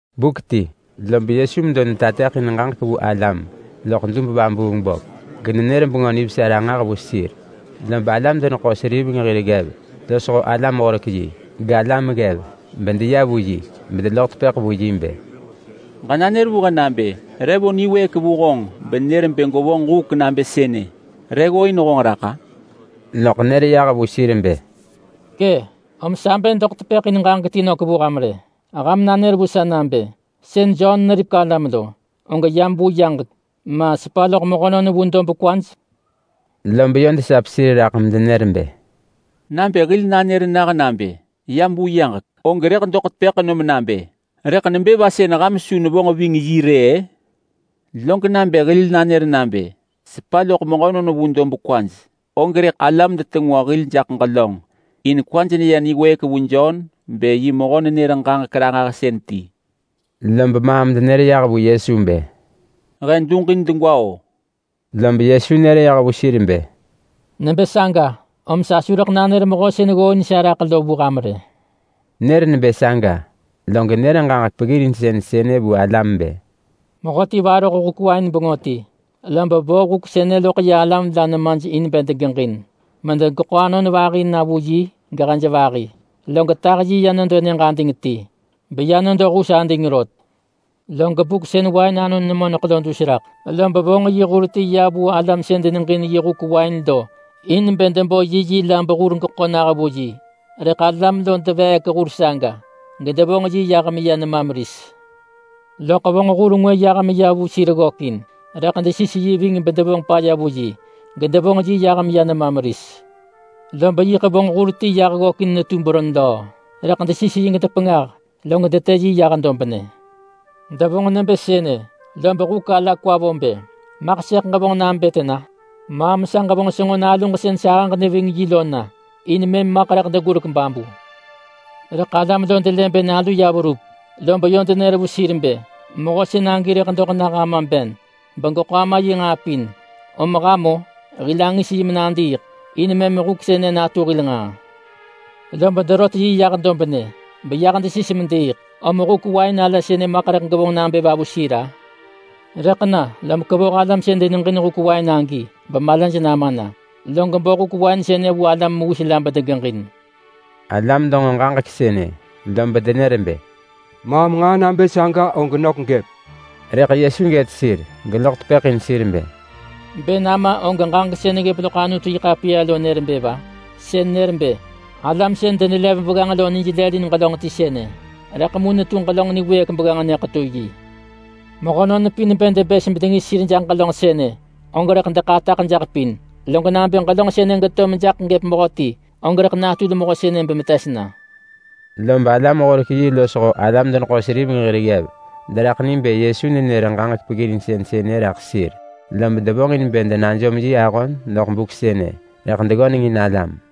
Buk ti, lob Yesu medo netateḳin ġaġek vu alam loḳ dub-vabuung-böp genenër Bengö Nivesa ranġah vu sir. Lob alam-deneḳo-seriveng hir ggev losho alam-horek-yi, galam ggev, bedeya vu yi. Bedeloḳ tepëḳ vu yi bë, “Ġenanër vu he nabë: Re vo niwëëk vu honġ benër bë gwevonġ huk nabë sënë? Re ggooin honġ raḳ-a?” Loḳ nër yah vu sir bë, “Kë, om sa bë doḳ tepëḳ in ġaġek ti nök vu ham rë. Ham nanër vu sa nabë: Sën Jon neripek alam lo, og yam vu yaġek, ma sepa loḳ mehönon vu dob kwaj?” Lob yö desap sir raḳ medenër bë, “Nabë hil nanër nah nabë: ‘Yam vu yaġek’, og rëḳ doḳ tepëḳ nom nabë: ‘Rëḳ nebë va sën ham su nevonġ ving yi rë-ë?’ Log nabë hil nanër nabë: ‘Sepa loḳ mehönon vu dob kwaj’, og rëḳ alam detengwa hil jaḳ ġelönġ. In kwaj neya niwëëk vu yi bë yi mehö-nenër-ġaġek-ranġahsën ti.” Lob maam denër yah vu Yesu bë, “He duġin degwa-o!” Lob Yesu nër yah vu sir bë, “Nebë saga, om sa su rëḳ nanër mehö sën ggooin sa raḳ lo vu ham rë.” Nër nebë saga, log nër ġaġek peggirinsën sënë vu alam bë, “Mehöti varoh huk wain bengö ti, lob vo huk sënë loḳ ya alam la nemaj in bë degeġin medegeḳo anon vahi natu yiyi gevahi natu hej. Log tah yi ya nedo nyëġ ading ti beya nedo hus ading rot. Log buk sën wain anon nemoneḳ lo dus raḳ, lob vonġ yi hur ti ya vu alam sën deneġin yi huk wain lo in bë debo yiyi la behur geḳo nah vu yi. Rëḳ alam lo deveek hur saga, gedevonġ yi yah meya nema meris. Loḳ vonġ hur ngwë yah meya vu sir ggökin. Rëḳ desis yi ving bedevonġ paya vu yi, gedevonġ yi yah meya nema meris. Lob yiḳ vonġ hur ti yah ggökin netu beron löö. Rëḳ desis yi gedepengah, log detë yi yah dobnë. Devonġ nebë sënë, lob huk ala kwa vo bë, ‘Maḳ sëḳ ġevonġ nabë tena? Maam sa ġevonġ senġo naluġ sën sahëġ neving yi lo na, in mëm maḳ rëḳ degurek babu.’ Rëḳ alam lo delë bë nalu ya verup, lob yö denër vu sir bë, ‘Mehö sën agi rëḳ doḳ nah ama ben begeḳo ama yi nġaa pin, om ham-o! Hil angis yi menadiiḳ. In mëm huk sënë natu hil nġaa.’ Lob derot yi yah dobnë, beyah desis mediiḳ. Om huk wain ala sënë maḳ rëḳ gevonġ nabë va vu sir-a? Rëḳ na, lom kevoh alam sën deneġin huk wain agi bemalaj nama na, log bo huk wain sënë vu alam mewis la bedegeġin.” Alam denġo ġaġek sënë lob denër bë, “Maam nġaa nabë saga og nök gëp!” Rëḳ Yesu gët sir geloḳ tepëḳ in sir bë, “Bë nama og ġaġek sën neggëp loḳ Anutu-yi-ḳapiya lo nër bë va? Sën nër bë: ‘Alam sën denelev begganġ lo nij lëlin ġelönġ ti sënë, rëḳ mu netu ġelönġ niwëëk begganġ nyëḳetu yi.’ Mehönon pin bë debës bedengis sir jaḳ ġelönġ sënë, og rëḳ deḳataḳ jaḳ pin. Log nabë ġelönġ sënë geto mejaḳ gëp mehöti, og rëḳ natul mehö sënë bemetes na.” Lob alam-horek-yi losho alam-deneḳo-seriveng hir ggev deraḳ ni bë Yesu nenër ġaġek peggirinsën sënë raḳ sir. Lob devonġin bë denajom yi ahon doḳ buk sënë, rëḳ deggönengin alam.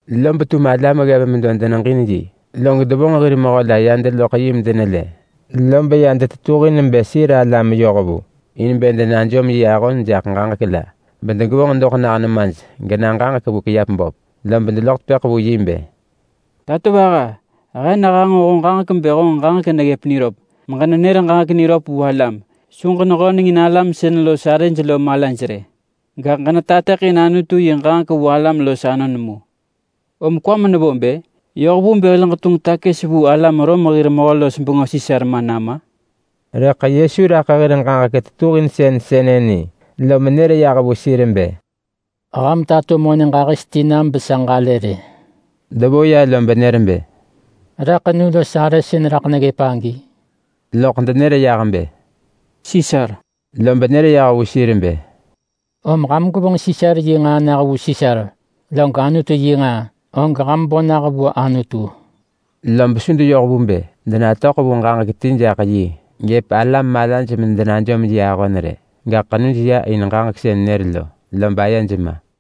Lob tum alam ggev medo deneġin yi. Log devonġ hir mehö la ya deloḳ yi medenelë. Lob ya detetuhin bë sir alam yohvu, in bë denajom yi ahon jaḳ ġaġek la bedegevonġ doḳ nah nemaj gena ġaġek vu kiap böp. Lob deloḳ tepëḳ vu yi bë, “Tatovaha, he nehanġo honġ ġaġek bë honġ ġaġek neya niröp, beġenenër ġaġek niröp vu alam. Su ġenehönengin alam sën los arëj lo malaj rë. Gaḳ ġenetateḳin Anutu yi ġaġek vu alam los anon mu. Om kwam nevo bë? Yoh vu bë hil ġetunġ takës vu alam Rom hir mehö-los-bengö Sisar ma nama?” Rëḳ Yesu raḳ hir ġaġek tetuhinsën sënë ni, lom nër yah vu sir bë, “Ham tato monë ġahis ti nam besa ġalë rë.” Devo ya lob nër bë, “Re ḳenu los arë sën raḳ neggëp agi?” Loḳ denër yah bë “Sisar.” Lob nër yah vu sir bë, “Om ham gwevonġ Sisar yi nġaa nah vu Sisar. Log Anutu yi nġaa, og ham bo nah vu Anutu.” Lob su deyoh vu bë denatöḳ vu ġaġek ti jaḳ yi gëp alam malaj medenajom yi ahon rë. Gaḳ ḳenuj ya in ġaġek sën nër lo, lob ayej ma.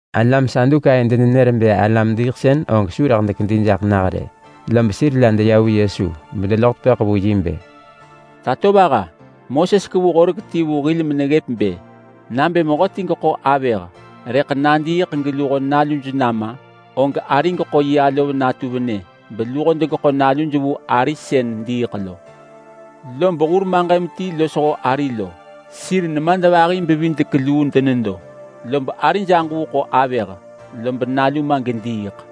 Alam Sadukai denenër bë alam-diiḳsën og su rëḳ dekedi jaḳ nah rë. Lob sir la deya vu Yesu, bedeloḳ tepëḳ vu yi bë, “Tatovaha, Moses kevu horek ti vu hil meneggëp bë, ‘Nabë mehöti geḳo avëh, rëḳ nadiiḳ geluho naluj nama, og ari geḳo yi alov natu venë beluho degeḳo naluj vu ari sën diiḳ lo.’ Lob hur maġëm ti losho ari lo, sir nemadvahi-bevidek-luu denedo. Lob arij aġuu ḳo avëh, lob nalu ma gediiḳ.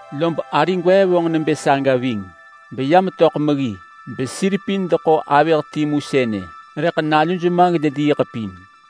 Lob ari gwee vonġ nebë saga ving, beya metöḳ meggi. Besir pin deḳo avëh timu sënë, rëḳ naluj ma, gedediiḳ pin.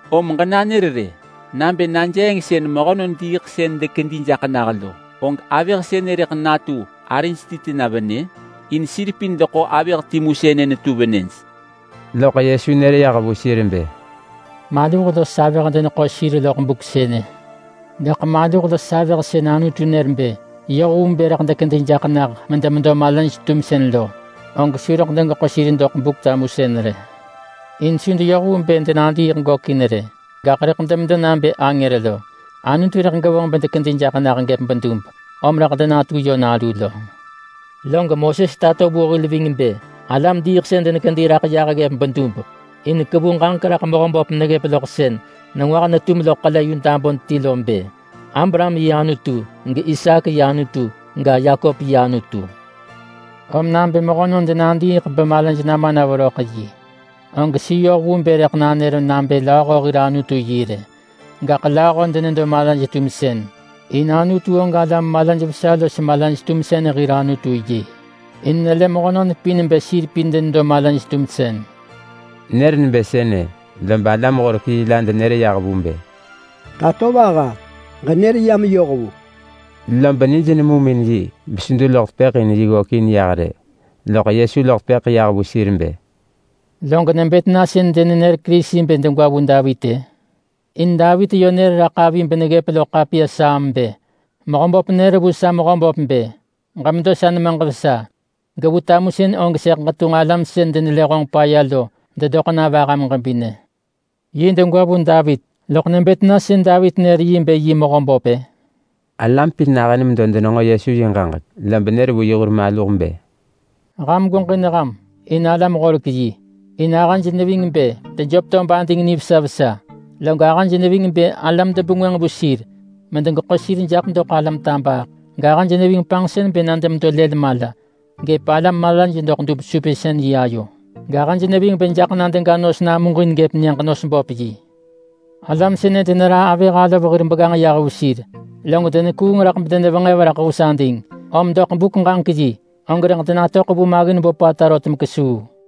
Om ġenanër nabë najeeng sën mehönon diiḳsën dekedi jaḳ nah lo, og avëh sënë rëḳ natu arij ti tena venë? In sir pin deḳo avëh timu sënë netu venëj.” Loḳ Yesu nër yah vu sir bë, “Maluh los avëh deneḳo sir loḳ buk sënë. Gaḳ maluh los avëh sën Anutu nër bë yoh vu bë rëḳ dekedi jaḳ nah medemedo malaj-tumsën lo, og su rëḳ degeḳo sir doḳ Buk-tamusën rë. In su deyoh vu bë denadiiḳ gökin rë. Gaḳ rëḳ demedo nabë angër lo. Anutu rëḳ gevonġ bedekedi jaḳ nah gëp bedub, om rëḳ denatu yö nalu lo. Log Moses tato vu hil ving bë alam-diiḳsën denekedi raḳ yah ggëp bedub. In kevu raḳ Mehöböp meneggëp loḳ ġaġek sën nengwah netum loḳ ḳele yu dabun ti lo bë, ‘Abraham yi Anutu, gIsaak yi Anutu ga, Yakop yi Anutu.’ Om nabë mehönon denadiiḳ bemalaj nama na veröḳ yi, og su yoh vu bë rëḳ nanër nabë lööho hir Anutu yi rë. Gaḳ lööho denedo malaj-tumsën, in Anutu og alam malaj vesa los malaj-tumsën hir Anutu yi. In nelë mehönon pin bë sir pin denedo malaj-tumsën.” Nër nebë sënë, lob alam-horek-yi la denër yah vu bë, “Tatovaha, ġenër ya meyoh vu.” Lob nij nemum in yi besu deloḳ tepëḳ in yi ggökin yah rë. Loḳ Yesu loḳ tepëḳ yah vu sir bë, “Log nebë tena sën denenër Kerisi bë degwa vu Davit-ë? In Davit yö nër raḳ avi beneggëp loḳ ḳapiya Saam bë: ‘Mehöböp nër vu sa Mehöböp bë: “Ġemedo sa nemaġ vesa. Gevu tamusën og sëḳ ġetunġ alam sën denelë honġ paya lo dedoḳ na vaham ġebinë.” ’ Yi degwa vu Davit, loḳ nebë tena sën Davit nër yi bë yi Mehöböp-ë?” Alam pin nahën medo denenġo Yesu yi ġaġek, lob nër vu yi hur maluh bë, “Ham gweġin ham in alam-horek-yi. In ahëj neving bë dejöp tob ading nivesa vesa. Log ahëj neving bë alam debengwënġ vu sir medegeḳo sir jaḳ doḳ alam tabaaḳ. Gahëj neving panġsën bë na demedo lël mala gëp alam malaj doḳ dub-supinsën-yi ayo, gahëj neving bë jaḳ na dega nos namuġin gëp nyëġ-nos-böp-yi. Alam sënë deneraa avëh alov hir begganġ yah vu sir, log denekuung raḳ bedenevenġev raḳ hus ading. Om doḳ buk-ġaġek-yi, og rëḳ denatöḳ vu maggin böpata rot mekesuu.”